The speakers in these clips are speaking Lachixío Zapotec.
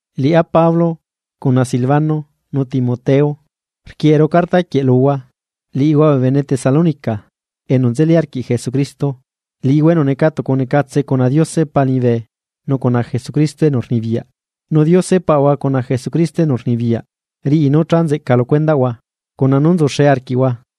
Liꞌá Pablo, cuna Silvano nu Timoteo, rquieꞌeru carta quieꞌ luhua, liꞌihua bee bene Tesalónica enu nzeli arquiꞌ Jesucristo, liꞌihua enu neca tucunecatse cuna Diose Pa liñibe nu cuna Jesucristo enu rnibiyaꞌ. Nu Diose Paꞌahua cuna Jesucristo enu rnibiyaꞌ riꞌi nú cha nzeꞌca lu cuendaꞌhua cuna nú nzuxe arquiꞌhua.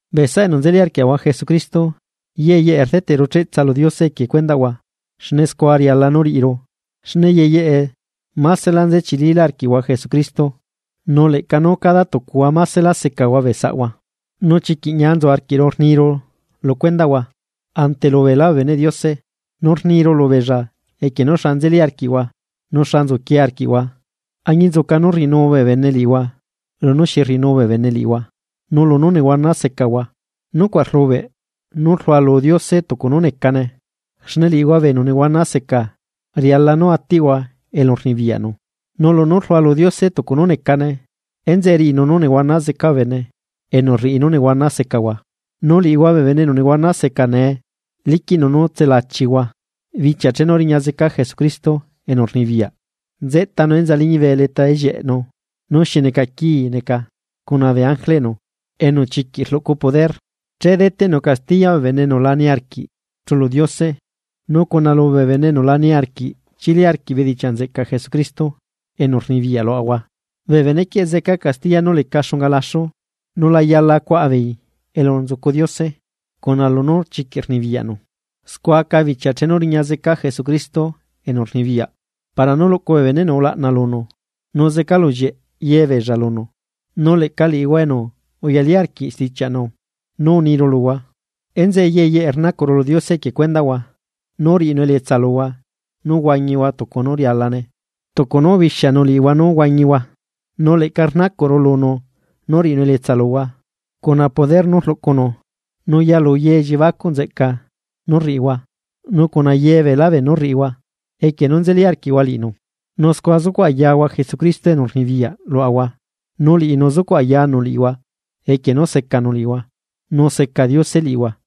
Bee saꞌa enu nzeli arquiaꞌahua Jesucristo ye yeꞌe rdeteꞌru cheꞌtsa lu Diose equie cuendaꞌhua, xne scua riala nú riꞌiru, xne ye yeꞌe másela nze chililá arquiꞌhua Jesucristo, nu leꞌca cada tucuhua maselá secahua bee saꞌhua. Nu chiquiꞌ ñia nzu arquiꞌru rniru lu cuendaꞌhua ante lu beelá bee beneꞌ Diose, nu rniru lubeella equie nú xa nzelí arquiꞌhua nu xa nzuquie arquiꞌhua añinzuca nú rriꞌinu bee bene liꞌihua lunú rriꞌinu bee bene liꞌihua, nu lunú nehuana secahua. Nucuaꞌ rlubeꞌ nú rlualu Diose tucu nú necane. Xne liꞌihua bee enu nehuana seca riala nú atiꞌhua elu rnibiyaꞌnu. Nu lunú rlualu Diose tucu nú necane, enzeꞌe riꞌinu nú nehuana zeca bee bene enu rriꞌi nú nehuana secahua. Nu liꞌihua bee enu nehuana seca nee, liquiꞌnu nú tselachiaꞌahua bichia chenu riña zeca Jesucristo enu rnibiyaꞌ, nzeꞌtanu enza liñibe leta ellieꞌnu nú xi neca quii neca cuna bee ángeleꞌnu enu chiquiꞌ rluꞌcu poder. Che deteꞌnu castiya bee bene enu la niarquiꞌ chulu Diose nu cuna lubee bene enu lá niarquiꞌ chili arquiꞌ bedichiaꞌ nzeꞌcaꞌ Jesucristo enu rnibiyaꞌ luaꞌahua. Bee benequieꞌ zeca castiya nú leca xunga laxu, nu la yala cuaꞌa beei elu nzucu Diose xne chiquiꞌ rnibiyaꞌnu. Scua aca bichia chenu riña zeca Jesucristo enu rnibiyaꞌ para nú luꞌcu bee beneꞌnu ulaꞌna lunu, nu zecalullieꞌ ye beella lunu, nu leꞌca liꞌihua enu uyali arquiꞌ stichiaꞌnu nú uniru luhua. Enzeꞌe ye yeꞌe rnacuꞌru lu Diose equie cuendaꞌhua, nú riꞌinu elietsa luhua nú huañihua tucu nú rialane tucu nú ubixianu liꞌihua nú huañihua. Nu leꞌca rnacuꞌru lunu nú riꞌinu elietsa luhua cuna poder nú rluꞌcunu nú yalu ye elliebacuꞌ nzeꞌca nú rriꞌihua, nu cuna ye beelá beenú rriꞌihua, equie nú nzeli arquiꞌhua liꞌinu. Nu scua zucuꞌ ayahua Jesucristo enu rnibiyaꞌ luaꞌahua nu liꞌinu zucuꞌ ayanu liꞌihua equie nú secanu liꞌihua nu seca Diose liꞌihua.